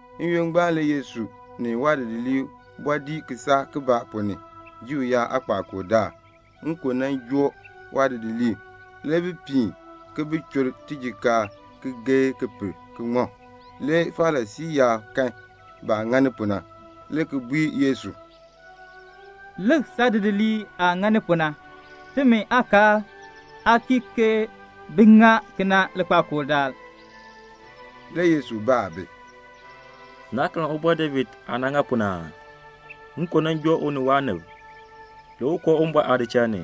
N-yoonn ngbaan le Yesu ni waadidiliib bɔɔ dii kisaak ponn ni Juu yaab aakpakool daal. Le nkon joo waadidiliib. Le bi piin ki bi chur tijikaar ki geei ki per ki ŋmɔ. Le Farisii yaab kan baah ŋani pu na, le ki bui Yesu, "Lik saadidiliib aah ŋani pu na. Timi aakaal aa kii ke bi ŋa kena likpakool daal." Le u baa bi, "Naa karn Ubɔr David aah nan ŋa pu na aa? Nkon nan joo u ni waanib. Le u koo Uwumbɔr aadichal ni.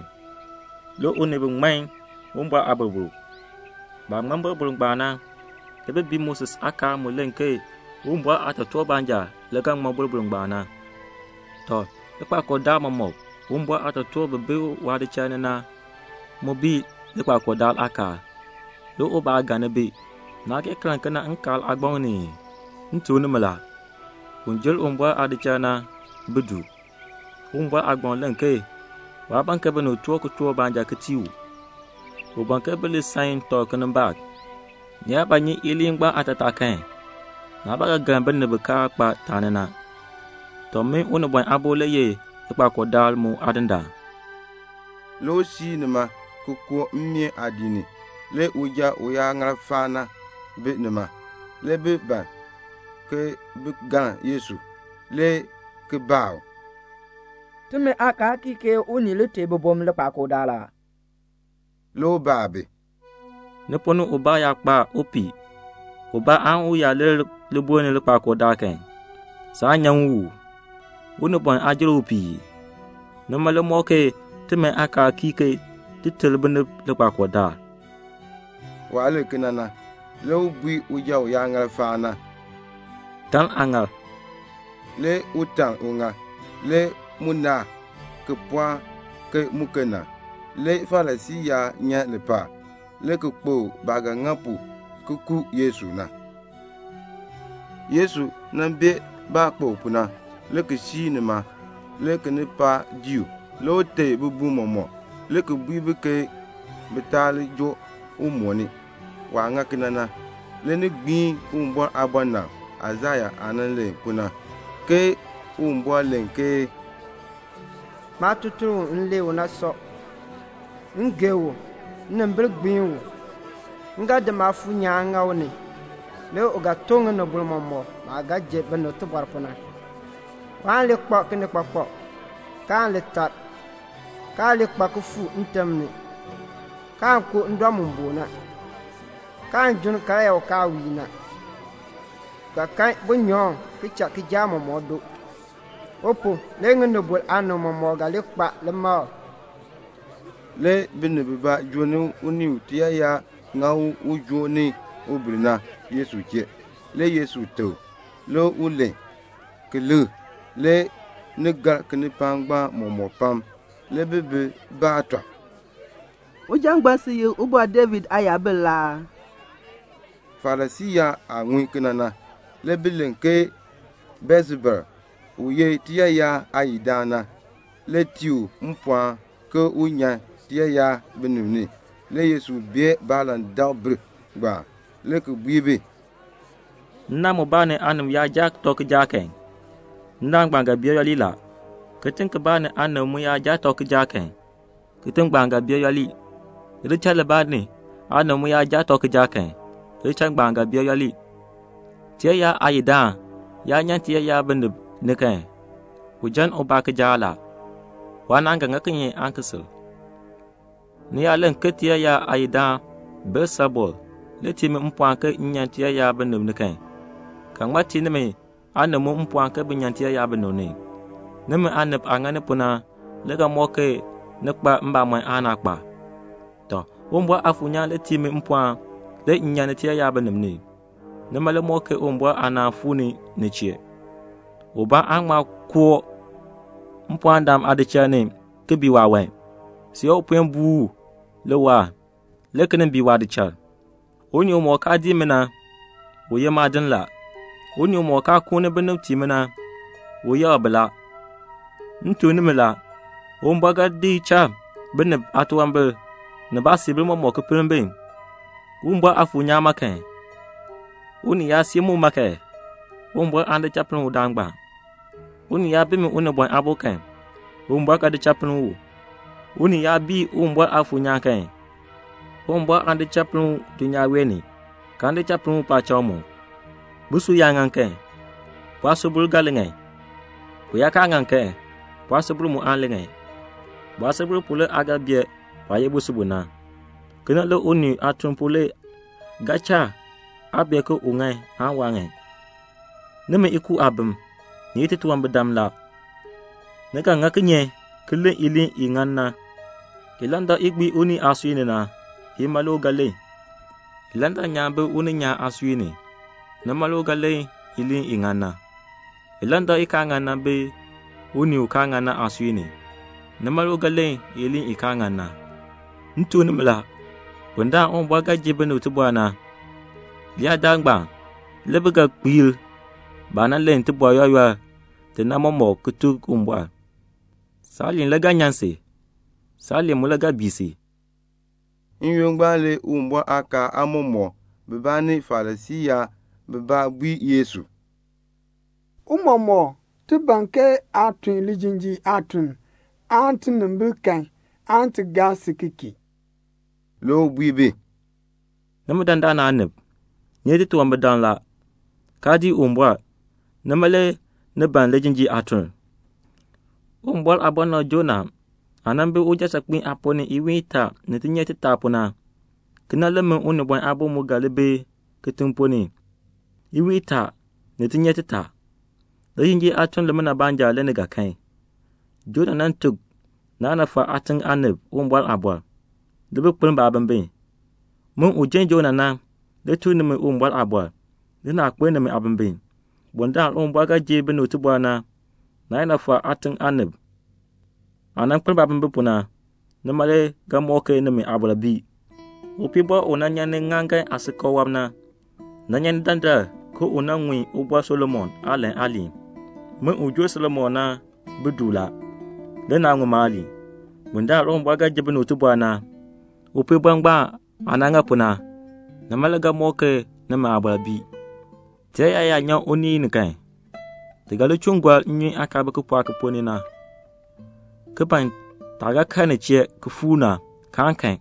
Le u ni bi ŋman Uwumbɔr aaboroboro. Baah ŋman boroboro ngbaan na, le bi bii Moses aakaal mu len ke Uwumbɔr aatotoortiib baanja le ga ŋmɔ boroboro ngbaan. Tɔ, likpakool daal mɔmɔk Uwumbɔr aatotoortiib bi bi waadichal ni na mu bii likpakool daal aakaal, le ubaa aa galn bi. Naah kee karn kena Nkaal aagbaŋ ni ii? M tuk nimi la, un jer Uwumbɔr aadichal na bi du. Uwumbɔr aagbaŋ len ke waa ban ke binib toor kitork baanja ki tii u. U ban ke bi li san tɔb kinimbaak. Ni yaa ba nyi iliin ngbaan aatataa kan, naa ba ga galn binib bi kaa kpa taani na. Tɔ, min Unibɔn Aabo le ye likpakool daal mu Aadindaan." Le u siir nima, le ki koo baameen aadiik ni. Le uja uyaaŋaal faan na bi nima. Le bi ban ke bin galn Yesu, le ki baa u, "Timi aakaal kii ke unii li teei bibum likpakool daal aa?" Le u baa bi, "Ni ponn ni ubaa yaa kpa upiih ubaa kan, u yaa lir libuln ni likpakool daal kan, saan nyan u uu? Unibɔn aa jer upiih ii? Nima le mɔk ke timi aakaal kii ke ti ter binib likpakool daal." Waah len kena na, le u bui uja uyaaŋaal faan na, "Taln aaŋaal." Le u taln uŋaal. Le mu naar, ki pɔɔk ke muken na. Le Farisii yaab nyan lipaal, le ki kpokl baah ga ŋa pu ki ku Yesu na. Le Yesu bee baah kpokl pu na, le ki siir nima. Le kinipaak dii u. Le u teei bibum mɔmɔk, le ki bui bi ke bi taa li joo u mooni. Waah ŋa kena na le ni gbiin Uwumbɔr aabɔnabr Aisaya aah nan len pu na, ke Uwumbɔr len ke "Maatutuln u m lee u na sɔ. M gee u. Nnimbil gbiin u. M ga di Maafuur nyaan ki di ŋa u ni. Le u ga tuk ŋinibol mɔmɔk maah ga ji binib tibɔr pu na. Waan li kpak kinikpakpak, kaan li teeni, kaan li kpa kifuuk ntim ni, kaan koo ndɔ mu boon na, kaan junn karyaa u kaa wiin na. U ga kan bunyaŋ ki cha kijaak mɔmɔk doo. U pu, le ŋinibol aanib mɔmɔk ga li kpa limakl." Le binib bibaa joo ni unii u tiyaayar ŋa u ujoon ni ubir na Yesu chee. Le Yesu teb u, le u len, le ki likr. Le ni gar kinipaak ngbaan mɔmɔk pam. Le bi bi baa tɔb, "Uja ngbaan ye Ubɔr David Aayabil aa?" Farisii yaab aah ŋun kena na, le bi len ke Beelsebul, u ye tiyaayar aayidaan na, le tii u mpɔɔn ke un nyan tiyaayar binib ni. Le Yesu bee baalandakbir, le ki bui bi, "Nnaan mubaa ni aanib yaa jaa tɔb kijaak kan, nnaan ngbaan ga bee yooli la. Kitiŋ kibaa ni aanib mu yaa jaa tɔb kijaak kan, kitiŋ ngbaan ga bee yooli. Lidichal libaa ni aanib mu yaa jaa tɔb kijaak kan, lidichal ngbaan ga bee yooli. Tiyaayar aayidaan yaa nyan tiyaayar binib ni kan, u jan ubaa kijaak la. Waanaan ga ŋa kinye aan ki sil? Ni yaa len ke tiyaayar aayidaan Beelsebul le tii mi mpɔɔn ke m nyan tiyaayar binib ni kan, ke ŋmaa tii nimi aanib mu mpɔɔn ke bin nyan tiyaayar binib ni? Nimi aanib aah ŋani pu na le ga mɔk ke ni kpa mbamɔn aan naa kpa. Tɔ, Uwumbɔr Aafuur nyaan le tii mi mpɔɔn le m nyan tiyaayar binib ni. Nima le mɔk ke Uwumbɔr aanaan fuu ni ni chee." "Ubaa aan ŋma koo mpɔɔndaan aadichal ni ki bii waawan, see u puen buu u le waahr, le ki nin bii waadichal. "Unii umɔk kaa dii mi na, u ye maadin la. Unii umɔk kaa kuuni binib tii mi na, u yaar bi la. M tuk nimi la, Uwumbɔr ga di cha binib aatunwambir ni baasiibil mɔmɔk ki pinn bi. Uwumbɔr Aafuur nyaan ma kan, unii yaa sii muma kan, Uwumbɔr aan di cha pinn udaan ngbaan. Unii yaa bii min Unibɔn Aabo kan, Uwumbɔr ga di cha pinn u. Unii yaa bii Uwumbɔr Aafuur nyaan kan, Uwumbɔr aan di cha pinn u dulnyaa wee ni, kaan di cha pinn u paacham." "Busub yaa ŋan kan, bu aasubil ga li ŋan. Bu yaa kaa ŋan kan, bu aasubil mu aan li ŋan. Bu aasubil pu le aa ga bee bu aah ye busub bu na. Kena le unii aatuln pu le ga cha aa bee ke u ŋan aan waa ŋan. Nimi ikuub aabim, ni ye titunwambirdam la. Ni ga ŋa kinye ki len iliin i ŋan na? Ilandak i gbii unii aasui ni na, ima le u ga len. Ilandak nyaan bi uninyaan aasui ni, nima le u ga len iliin i ŋan na. Ilandak i kaa ŋan na bi unii u kaa ŋan na aasui ni, nima le u ga len iliin i kaa ŋan na. "M tuk nimi la, bundaln Uwumbɔr ga ji binib tibɔr na, leyaadaal ngbaan le bi ga kpiir baah nan len iliin yooli yooli na mɔmɔk ki tuk Uwumbɔr. Saaliin le ga nyan si. Saaliin mu le ga bii si." N-yoonn ngbaan le Uwumbɔr aakaal aamɔmɔkb bibaa ni Farisii yaab bibaa bui Yesu, "Tiicha, ti ban ke aa tun lijinjiir aatuln, aan tinimbil kan, aan ti gaa si ki kii." Le u bui bi, "Nimi dandana aanib, ni ye titunwambirdam la, kaa dii Uwumbɔr, nima le ni ban lijinjiir aatuln. Uwumbɔr aabɔnabr Jonah aah nan bi ujan saakpiin aaponn ni iwiin itaa ni tinyer titaa pu na, kena le min Unibɔn Aabo mu ga li bi kitiŋ ponn ni iwiin itaa ni tinyer titaa. Lijinjiir aatuln limina baanja le ni ga kan. Jonah nan tuk Ninefa aatiŋ aanib Uwumbɔr aaliin. Le bi kpeln baabimbin. Min, u jer Jonah na, le tuk nimi Uwumbɔr aaliin, le naa kpeln nimi aabimbin. Bundaln Uwumbɔr ga ji binib tibɔr na, Ninefa aatiŋ aanib aah nan kpeln baabimbin pu na, nima le ga mɔk ke nimi aabɔr bii. Upiibɔr u nyan ni ŋŋaaŋgan aasikakl wɔb na, nan nyan ni dandar ke u nan ŋun Ubɔr Solomon aalan aaliin. Min u jer Solomon na bi du la, le naa ŋun maaliin. Bundaln Uwumbɔr ga ji binib tibɔr na, upiibɔr ngbaan aah nan ŋa pu na, nima le ga mɔk ke nimi aabɔr bii." "Tiyaayar yaa nyan unii ni kan, ti ga li chuun gɔr nnyun aah kaa bi kipɔɔk ki ponn ni na, ki ban taah ga kal nin chee ki fuur na, kaan kan.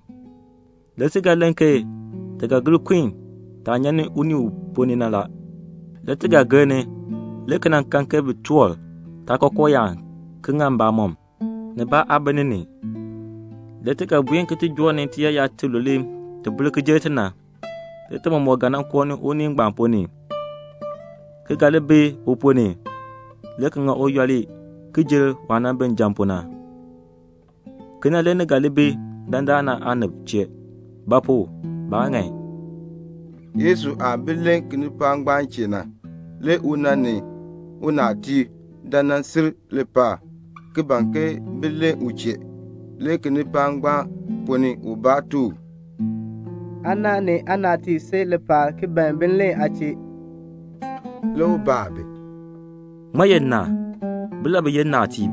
Le ti ga len ke ti ga gir kun taah nyan unii u ponn ni na la. Le ti ga gir ni, le ki nan kan ke bi toor taakookooyaan ki ŋa mbamɔm, nibaa aa bi ni ni. Le ti ga buen ki ti joo ni tiyaayar tilule ti bir ki jer ti na. Le ti mɔmɔk ga koo unii ngbaan ponn ni, ki ga li bi u ponn ni, le ki ŋa u yooli ki jer waah nan bi njan na pu na. Kena le ni ga ŋa ki tii dandana aanib; ba pu? baa ŋan." Yesu aah bi len kinipaak ngbaan chee na, le una ni unaatiib dan nan sil lipaal ki ban ke bin len u chee. Le kinipaak ngbaan ponn ni ubaa tuk u, "Aana ni aanaatiib si lipaal ki ban bin len aa chee." Le u baa bi, "Ŋmaa ye nna? Bilabi ye nnaatiib?"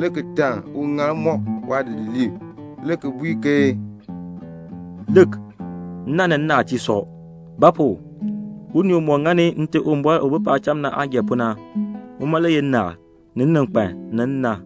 Le u taln uŋaal waadidiliib wɔb, le ki bui ke "Lik, nna ni nnaatiib sɔ. Ba pu? unii umɔk ŋani Nte Uwumbɔr u bi paacham na aah gee pu na, uma le ye nnaal, ni nninkpan, ni nna."